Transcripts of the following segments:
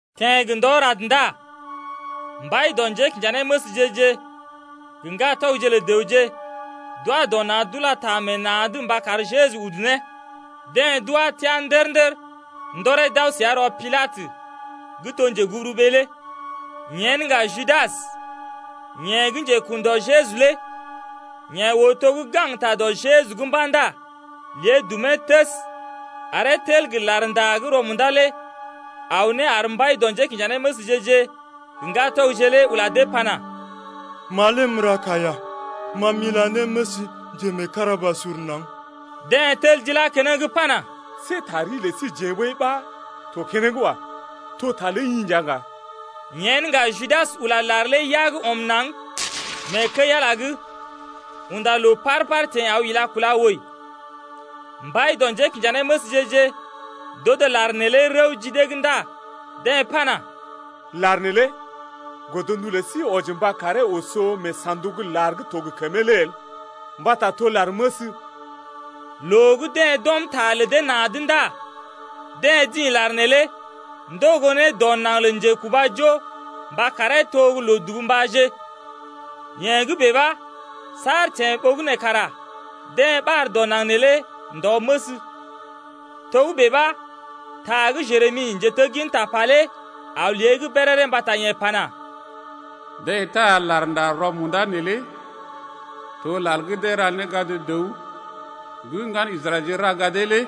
Teḛ gə ndɔ rad ndá mbai dɔ njékinjanéməsje-je gə ŋgatɔgje lə dəwje d’wa dɔ na̰ d’ula ta meḛ na̰’d mba kar Jeju udu ne. Deḛ d’wá teá ndər-ndər, ndɔree d’aw səa rɔ Pilatə gə́ to njeguburuɓee lé. Yen ŋga Judas, yeḛ gə́ njekun dɔ Jeju lé yeḛ oo to gə́ gaŋgta dɔ Jeju’g mba̰ ndá lé dumee təs aree tel gə larnda gə́ rɔ-munda lé aw ne ar mbai dɔ njékinjanéməsje-je gə ŋgatɔgje lé ula dee pana: Ma lé m’ra kaiya, ma m’ila ne məs njemeekarabasur naŋg. Deḛ tel d’ilá keneŋ pana: See ta ri lə síjeḛ ɓəi ɓa to keneŋ wa. To ta ləi i nja ŋga. Yen ŋga Judas ula lar lé yag ɔm naŋg mee kəi-Ala’g, unda loo paar-paar teḛ aw ila kúla wəi. Mbai dɔ njékinjanéməsje-je d’odo lar neelé rəw ji dee’g ndá deḛ pana: Lar neelé godndu lə sí wɔji mba karee oso mee sa̰duk lar gə́ to gə kəmee lé el mbata to lar məs. Loo gə́ deḛ d’ɔm ta lə dee na̰’d ndá deḛ dḭ lar neelé ndogo ne dɔ naŋg lə njekubajo mba karee to gə́ loo-dubu mbáje. Yee gə́ bèe ɓa saar teḛ ɓogənè kara deḛ ɓar dɔ naŋg neelé ndɔ-məs. Togə́bè ɓa ta gə́ Jeremi, njetegginta pa lé aw lée’g béréré mbata yeḛ pana: Deḛ taa larnda rɔ-munda neelé to lar gə́ deḛ ra ne gad dəw gə́ ŋgan Israɛlje ra gadee lé.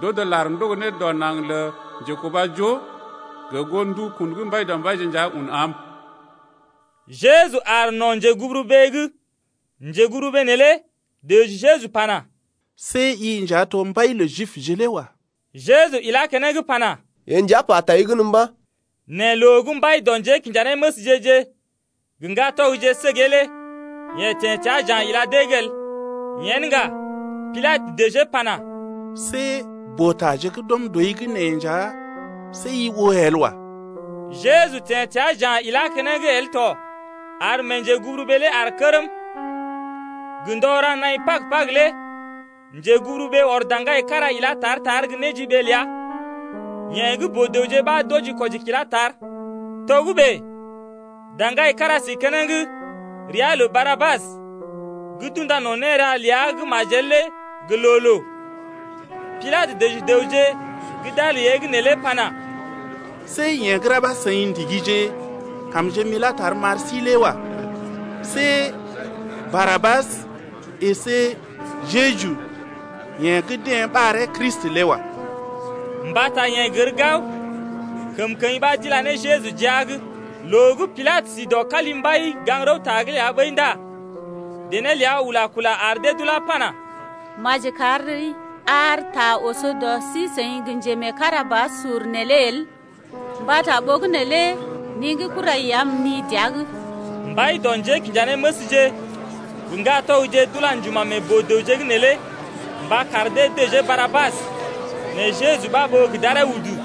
D’odo lar ndogo ne dɔ naŋg lə njekubajo gə goo ndukun gə́ Mbaidɔmbaije nja un am. Jeju aar no̰ njeguburuɓee’g. Njeguburuɓee neelé dəji Jeju pana: See i nja to mbai lə Jibje lé wa. Jeju ilá keneŋ pana: Yee nja pa tai gən mba̰. Nɛ loo gə́ mbai dɔ njékinjanéməsje-je gə ŋgatɔgje səgee lé yeḛ teḛ təa ja̰ ila dee’g el. Yen ŋga Pilatə dəjee pana: See boo-taje gə́ d’ɔm dɔi’g nee nja, see i oo el wa. Jeju teḛ təa ja̰ ilá keneŋ el tɔ ar mee njeguburuɓee lé aar kərm. Gə ndɔ ra naḭ Pag-Pag lé njeguburuɓee ɔr daŋgai kára ilá tar-tar gə́ néjiɓee ləa, yeḛ gə́ boo-dəwje ɓa d’wɔji-kwɔji kilá tar. Togə́bè daŋgai kára si keneŋ ria lə Barabas gə́ d’unda no̰ néra ləa gə́ majel lé gə loo-loo. Pilatə dəji dəwje gə́ d’aar lée’g neelé pana: See yeḛ gə́ rá ɓa seḭ ndigije kamje m’ilá tar m’ar sí lé wa. See Barabas əsé Jeju, yeḛ gə́ deḛ ɓaree Kristi lé wa. Mbata yeḛ gər gao, kəmkəḭ ɓa d’ila ne Jeju jia’g. Loo gə́ Pilatə si dɔ kalimbai gaŋg-rəwta’g ɓəi ndá dené ləa ula-kula ar dee d’ulá pana: Maji kari ar ta oso dɔ sí-seḭ gə njemeekarabasur’g neelé el, mbata ɓogənè lé ni gə́ kurai ya m’ni dəa’g. Mbai dɔ njékinjanéməsje gə ŋgatɔgje d’ula njuma̰ meḛ boo-dəwje’g neelé mba kar dee dəjee Barabas, nɛ Jeju ɓa ɓó gə d’aree udu.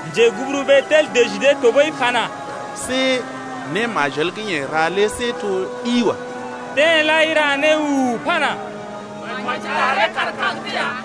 Njeguburuɓee lé tel dəji dee tɔɓəi pana: See né majel gə́ yeḛ ra lé see to gə́ ɗi wa. Deḛ lai ra né u-u-u pana: Maji ɗaree kaar kag’d ya.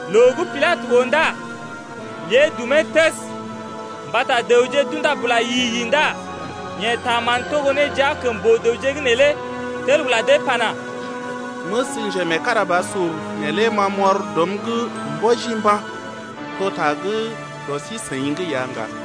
Loo gə́ Pilatə oo ndá lé dumee təs mbata dəwje d’unda bula yi-yi ndá yeḛ taa mán togo ne jia kəm boo-dəwje’g neelé tel ula dee pana: Məs njemeekarabasur neelé ma m’ɔr dɔm’g mbɔji mba̰. To ta gə́ dɔ sí-seḭ’g ya ŋga.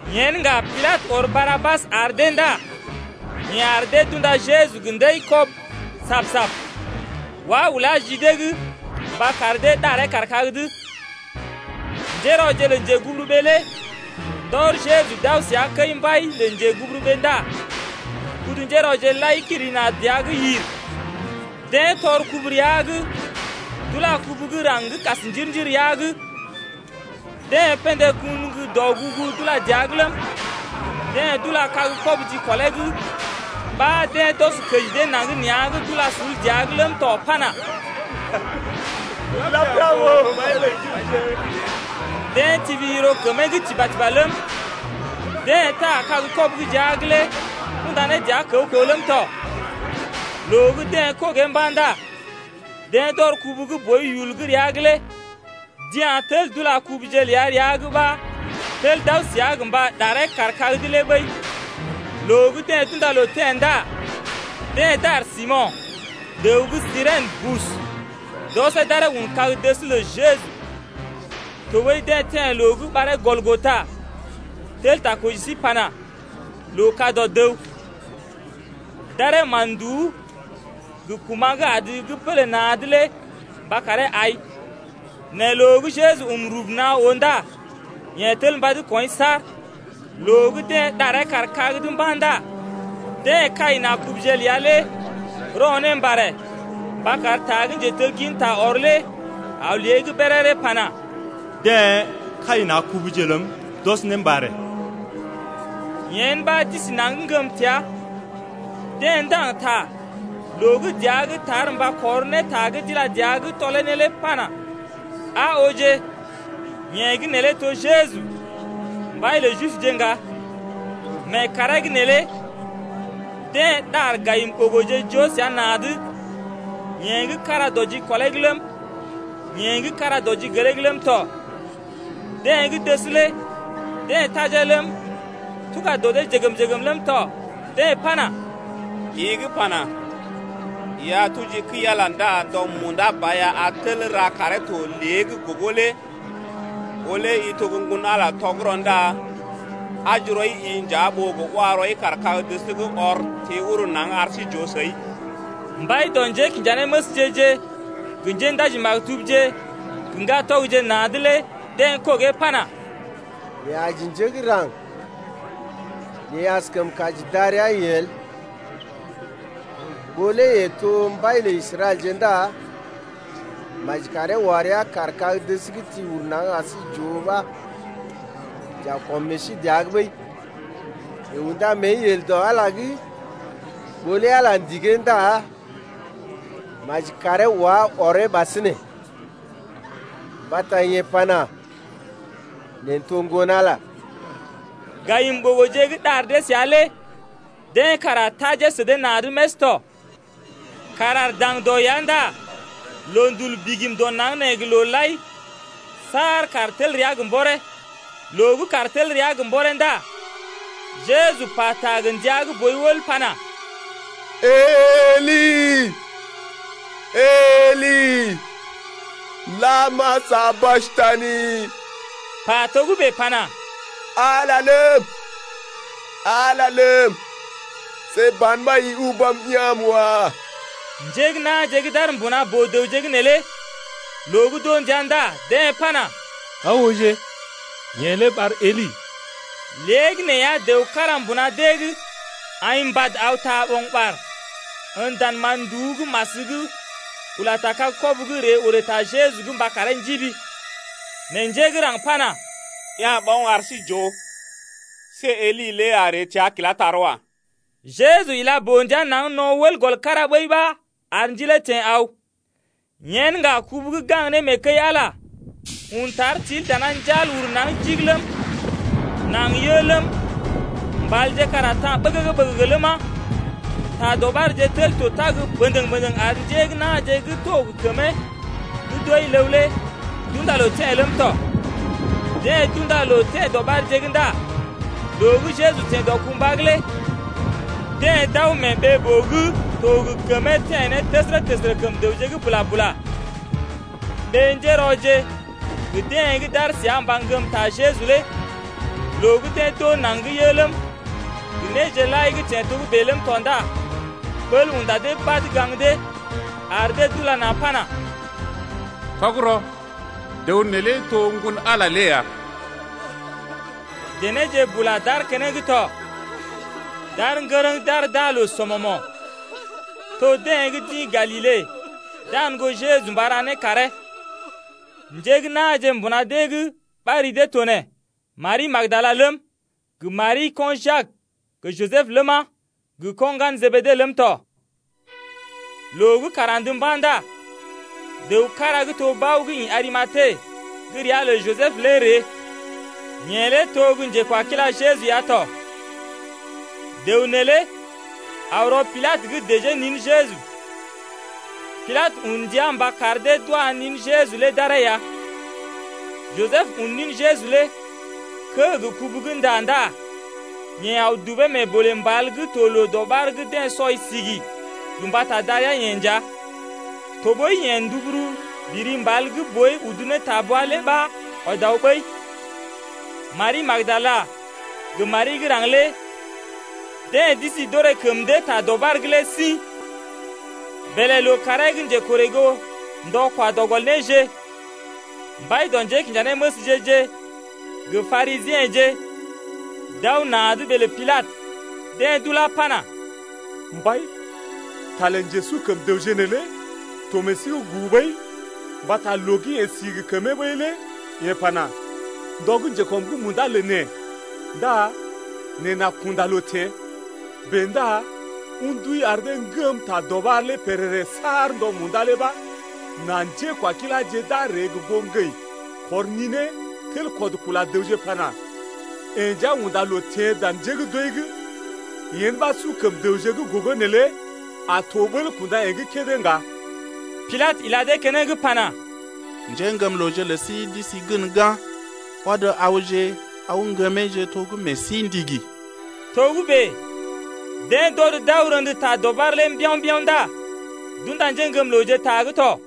Yen ŋga Pilatə ɔr Barabas ar dee ndá yeḛ ar dee d’unda Jeju gə ndəi-kɔb sab-sab, wá ulá ji dee’g mba kar dee ɗaree kaar kag’d. Njérɔje lə njeguburuɓee lé ndɔr Jeju d’aw səa kəi-mbai lə njeguburuɓee ndá kudu-njérɔje lai kiri na̰ dəa’g yir. Deḛ tɔr kubu rəa’g d’ula kubu gə́ raŋg gə́ kas njir-njir rəa’g. Deḛ pḛdé kun gə́ dɔgugu d’ula dəa’g ləm, deḛ d’ula kag-kɔbə jikɔlee’g ɓa deḛ d’ɔs kəji dee naŋg nea̰’g d’ula sul dəa’g ləm tɔ pana: Lapia ɓòo, mbai lə Jibje. Deḛ tibi yiro kəmee’g tiba-tiba ləm, deḛ taa kag-kɔbə gə́ jia’g lé kunda ne dəa kəw-kəw ləm tɔ. Loo gə́ deḛ kogee mba̰ ndá deḛ d’ɔr kubu gə́ boi yul gə́ rəa’g lé d’ya̰ tel d’ula kubuje ləa rəa’g ɓa tel d’aw səa gə mba ɗaree kaar kag’d lé ɓəi. Loo gə́ deḛ d’unda loo teḛ ndá deḛ dar Simo̰, dəw gə́ Sirèn bus d’ɔsee d’aree un kag-dəs lə Jeju. Tɔɓəi deḛ teḛ loo gə́ ɓaree Gɔlgota, tel ta koji sí pana: Loo ka dɔ dəw. D’aree mán-nduú gə kuma̰ gə́ adə gə́ pélé na̰’d lé mba karee ai, nɛ loo gə́ Jeju um rub naa oo ndá yeḛ tel mbad kɔḭ saar. Loo gə́ deḛ ɗaree kaar kag’d mba̰ ndá deḛ kai na̰ kubuje ləa lé rɔ ne mbarè mba kar ta gə́ njetegginta ɔr lé aw lée’g béréré pana: Deḛ kai na̰ kubuje ləm, d’ɔs ne mbarè dɔ’g. Yen ɓa d’isi naŋg ŋgəm təa. Deḛ ndaŋg ta loo gə́ dəa gə́ tar mba kɔr ne ta gə́ d’ila dəa’g tɔlee ne lé pana: Aa ooje, yeḛ gə́ neelé to Jeju, mbai lə Jibje ŋga. Mee kàree’g neelé deḛ ɗar gayim-ɓogoje joo səa na̰’d, yeḛ gə́ kára dɔ jikɔlee’g ləm, yeḛ gə́ kára dɔ jigelee’g ləm tɔ. Deḛ gə́ dəs lé deḛ tajee ləm, tuga dɔ dee jəgm-jəgm ləm tɔ 0Deḛ pana: I gə́ pana: I a tuji kəi-Ala ndá ndɔ munda ba ya a tel ra karee to lée’g gogo lé ɓó lé i to gə́ Ŋgon-Ala tɔgərɔ ndá aji rɔi-i nja ɓó gə wa rɔi kaar kag-dəs’g ɔr ti uru naŋg ar sí j’oo səi. Mbai dɔ njékinjanéməsje-je gə njéndaji-maktubje gə ŋgatɔgje na̰’d lé deḛ kogee pana: Yeḛ aji njé gə́ raŋg nɛ yeḛ askəm kaji darəa-yeḛ el. Ɓó lé yeḛ to mbai lə Israɛlje ndá maji karee wa rəa kaar kag-dəs’g ti uru naŋg ar sí j’oo ɓa j’a kɔm meḛ sí dəa’g ɓəi. Yeḛ unda mée yel dɔ Ala’g lé, ɓó lé Ala ndigee ndá maji karee wá ɔree ɓasinè. Mbata yeḛ pana: Neḛ n’to Ŋgon-Ala ya. Gayim-ɓogoje gə́ ɗar dee səa lé deḛ kara tajee sə dee na̰’d més tɔ. Kàr aar daŋdɔ ya ndá loondul bigim dɔ naŋg nee gə loo lai saar kàr tel rəa gə mbɔree. Loo gə́ kàr tel rəa gə mbɔree ndá Jeju pata gə ndia gə́ boi wəl pana: Eli, Eli, lama sabaktani, pa togə́bè pana: Ala ləm, Ala ləm, see ban ɓa i ubam ya̰’m wa. Njé gə́ na̰je gə́ d’aar mbuna boo-dəwje’g neelé loo gə́ d’oo ndia ndá deḛ pana: Aa ooje, yeḛ lé ɓar Eli. Léegəneeya dəw kára mbuna dee’g aḭ mbad aw taa ɓo̰gɓar en dan mán-nduú gə́ mas’g ula ta kag-kɔbə’g ree orè ta Jeju’g mba karee njibi. Nɛ njé gə́ raŋg pana: Ya̰ ɓoŋ ar sí j’oo, see Eli lé a ree təa kilá tar wa. Jeju ila boo-ndia naŋg no̰ wəl gɔl kára ɓəi ɓa ar ndilee teḛ aw. Yen ŋga kubu gə́ gaŋg ne mee kəi-Ala lé un tar til dana njal uru naŋg jig ləm, naŋg yə ləm, mbalje kara ta̰ ɓəgəgə-ɓəgəgə ləma 2ta dɔɓarje tel to tag bəndəŋ-bəndəŋ ar njé gə́ na̰je gə́ to gə kəmee gə́ d’wəi ləw lé d’unda loo teḛ ləm tɔ. Deḛ d’unda loo teḛ dɔɓarje’g ndá loo gə́ Jeju teḛ dɔkumbwa’g lé deḛ d’aw mee ɓee-boo gə́ to gə kəmee teḛ ne təsərə-təsərə kəm dəwje’g bula-bula. Ɓé-njérɔje gə deḛ gə́ d’aar səa mba ŋgəm ta Jeju lé loo gə́ deḛ d’oo naŋg gə́ yə ləm, gə néje lai gə́ teḛ togə́bè ləm tɔ ndá ɓəl unda dee badə gaŋg dee ar dee d’ula na̰ pana: Tɔgərɔ, dəw neelé to Ŋgon-Ala lé ya. Denéje bula d’aar keneŋ tɔ, d’aar ŋgərəŋ d’aar d’aa loo sɔmɔmo̰, to deḛ gə́ d’ḭ Galile dan goo Jeju mba ra né karee lé. Njé gə́ na̰je mbuna dee’g ɓa ri dee to nee, Mari gə́ Magdala ləm, gə Mari, ko̰ Jak gə Jisəb ləma, gə ko̰ ŋgalə Jebede ləm tɔ. Loo gə́ kàr andə mba̰ ndá dəw kára gə́ to bao gə́ ḭ Arimate gə́ ria lə Jisəb lé ree, yeḛ lé to gə́ njekwakila Jeju ya tɔ. Dəw neelé aw rɔ Pilatə’g dəjee nin Jeju. Pilatə un ndia mba kar dee d’wa nin Jeju lé d’aree ya. Jisəb un nin Jeju lé kə́ gə kubu gə́ nda ndá yeḛ aw dubee mee bolè mbal gə́ to loo-dɔɓar gə́ deḛ sɔi sigi gə mbata darəa-yeḛ nja. Tɔɓəi yeḛ nduburu biri mbal gə́ boi udu ne ta bwa lé ɓa ɔd aw ɓəi. Mari gə́ Magdala gə Mari gə́ raŋg lé deḛ d’isi d’orè kəm dee ta dɔɓar’g lé sḭ. Bèlè lookàree gə́ njekorè goo ndɔ kwa dɔ gɔl néje, mbai dɔ njékinjanéməsje-je gə Parisiḛje d’aw na̰’d ɓee lə Pilatə. Deḛ d’ulá pana: Mbai, ta lə njesu kəm dəwje neelé to meḛ sí’g gu ɓəi mbata loo gə́ yeḛ si gə kəmee ɓəi lé yeḛ pana: ndɔ gə́ njekɔm’g munda lə neḛ ndá neḛ n’a kunda loo teḛ. Bèe ndá un ndui ar dee ŋgəm ta dɔɓar lé pèrèrè saar ndɔ munda lé ɓa nà njékwakiláje d’a ree gə goo ŋgəḭ kɔr ninee tel kɔd kula dəwje pana: Yeḛ nja unda loo teḛ dan njé gə́ d’wəi’g. Yen ɓa su kəm dəwje gə́ gogo neelé a to ɓəl kunda yeḛ gə́ kédé ŋga. Pilatə ila dee keneŋ pana: Njéŋgəmlooje lə sí d’isi gən ga̰, ɔd awje aw ŋgəmeeje to gə́ meḛ sí ndigi. Togə́bè deḛ d’ɔd d’aw rḛdə ta dɔɓar lé mbiao̰-mbiao̰ ndá d’unda njéŋgəmlooje ta’g tɔ.